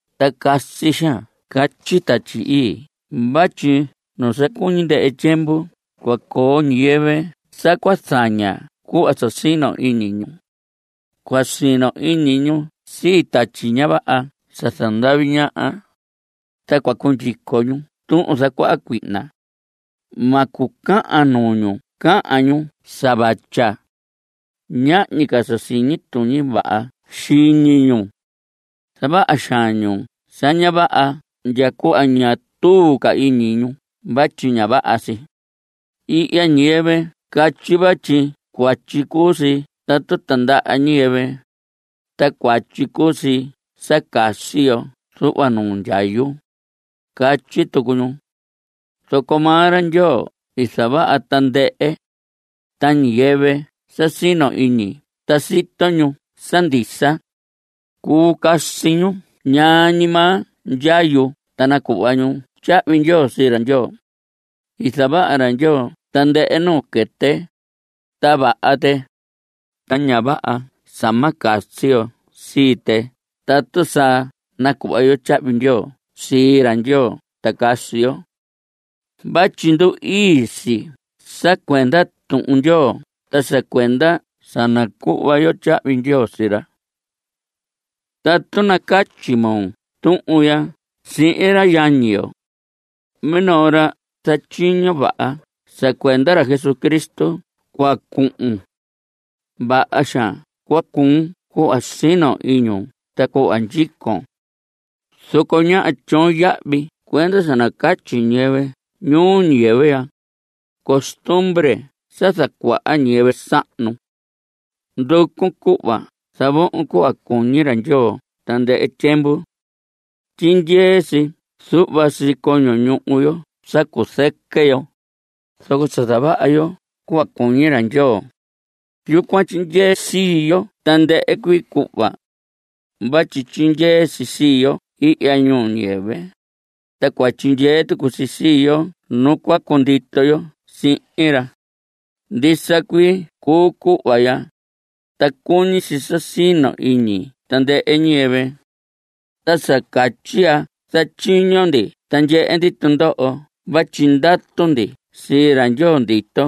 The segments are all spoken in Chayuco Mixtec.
Ta casi xaan catyi Tatyi Ii vatyi nu sa cuñi ndɨhɨ tyiemvu cua coo ñiyɨvɨ sa cua zaña cuhva sa sino iñi ñu. Cua sino iñi ñu sii tatyi ña vaha sa zandavi ñaha. Ta cua cundyico ñu tuhun zacuaha cuihna. Ma cucahan nuu ñu cahan ñu sa vatya. Ñahñi ca sa siñi tuñi vaha xiñi ñu. Zavaha xaan ñu sa ña vaha ndya cuhva ña tuu ca iñi ñu vatyi ña vaha si. Ihya ñiyɨvɨ catyi vatyi cuatyi cuu si tatu tindaha ñiyɨvɨ, ta cuatyi cuu si sa casi yo zuhva nuu ndyayu, catyi tucu ñu. Zoco maa ra Ndyoo i zavaha tandɨhɨ, ta ñiyɨvɨ sa sino iñi ta sito ñu sa ndisa, cuu casi ñu ñaa ñi maa ndyayu ta nacuhva ñu tyahvi ndyoo sii ra Ndyoo. I zavaha ra Ndyoo tandɨhɨ nuu quɨtɨ, ta vaha tɨ. Ta ña vaha sa ma casi yo sii tɨ tatu sa nacuhva yo tyahvi ndyoo sii ra Ndyoo ta casi yo. Vatyi ndu‑ii si sa cuenda Tuhun Ndyoo ta sa cuenda sa nacuhva yo tyahvi ndyoo sii ra. Tatu nacatyi moo tuhun ya sihin ra yañi yo, minoo ra zatyiño vaha sa cuenda ra Jesucristo cua cuun. Vaha xaan cua cuu cuhva sino iñun ta cuhva ndyicon. Zoco ñáha tyoon yahvi cuendu sa nacatyi ñiyɨvɨ ñuu ñiyɨvɨ ya, costumbre sa zacuaha ñiyɨvɨ sahnu. Nducun cuhva zavohon cuhva cuñi ra Ndyoo tandɨhɨ tyiemvu. Tyindyee si zuhva sii coño ñuhu yo sa cuzɨquɨ yo, zoco sa zavaha yo cuhva cuñi ra Ndyoo, yucuan tyindyee sii yo tandɨhɨ cuii cuhva. Vatyi tyindyee si sii yo ihya ñuu ñiyɨvɨ, ta cua tyindyee tucu si sii yo nu cua cundito yo sihin ra. Ndisa cuii cuu cuhva ya, ta cuñi si sa sino iñi tandɨhɨ ñiyɨvɨ. Ta sa catyi ya zatyiño ndi ta ndyehe ndi tundoho vatyi ndatu ndi sii ra Ndyoo ndito.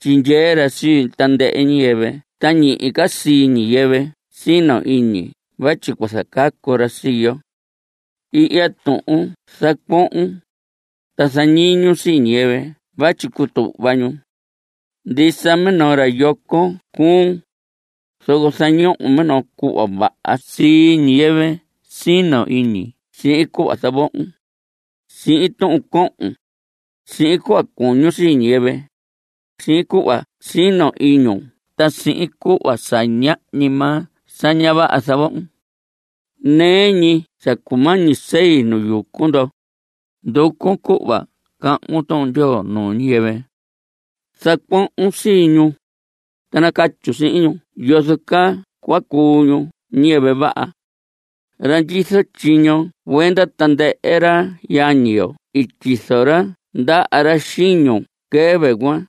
Tyindyee ra sii tandɨhɨ ñiyɨvɨ ta ñihi ca sii ñiyɨvɨ sino iñi vatyi cua zacacu ra sii yo. Ihya tuhun zacuohon, ta zañiñun sii ñiyɨvɨ vatyi cutuhva ñu. Ndisa minoo ra yoco cuun, zoco zañohon minoo cuhva vaha sii ñiyɨvɨ sino iñi sihin cuhva zavohon, sihin tuhun cohon, sihin cuhva cuñun sii ñiyɨvɨ, sihin cuhva sino iñun ta sihin cuhva sa ñahñi maa sa ña vaha zavohon. Nɨɨ ñi sa cumañi sei nu yucu ndo, nducun cuhva cahvun Tuhun Ndyoo nuu ñiyɨvɨ. Zacuohon sii ñu, ta nacatyun sihin ñu yozo caa cua cuu ñu ñiyɨvɨ vaha. Ra ndyizo tyiño cuenda tandɨhɨ ra yañi yo i tyizo ra ndaha ra xiñun quɨvɨ cuan,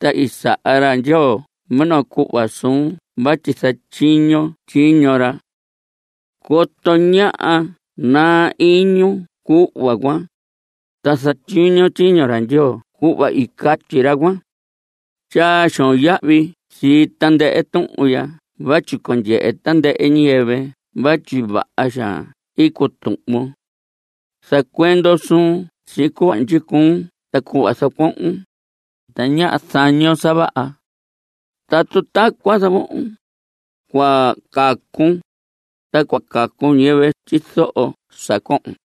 ta i saha ra Ndyoo minoo cuhva suun vatyi zatyiñon tyiño ra. Coto ñáha naa iñun cuhva cuan, ta zatyiñon tyiño ra Ndyoo cuhva i catyi ra cuan. Tyaa xoon yahvi sii tandɨhɨ tuhun ya vatyi cua ndyehe tandɨhɨ ñiyɨvɨ vatyi vaha xaan i cutuhvon. Zacuendon suun sihin cuhva ndyicuun ta cuhva zacuohon, ta ñáha zañon sa vaha. Tatu tacuan zavohon, cua cacun, ta cua cacu ñiyɨvɨ tyizoho sa cohon.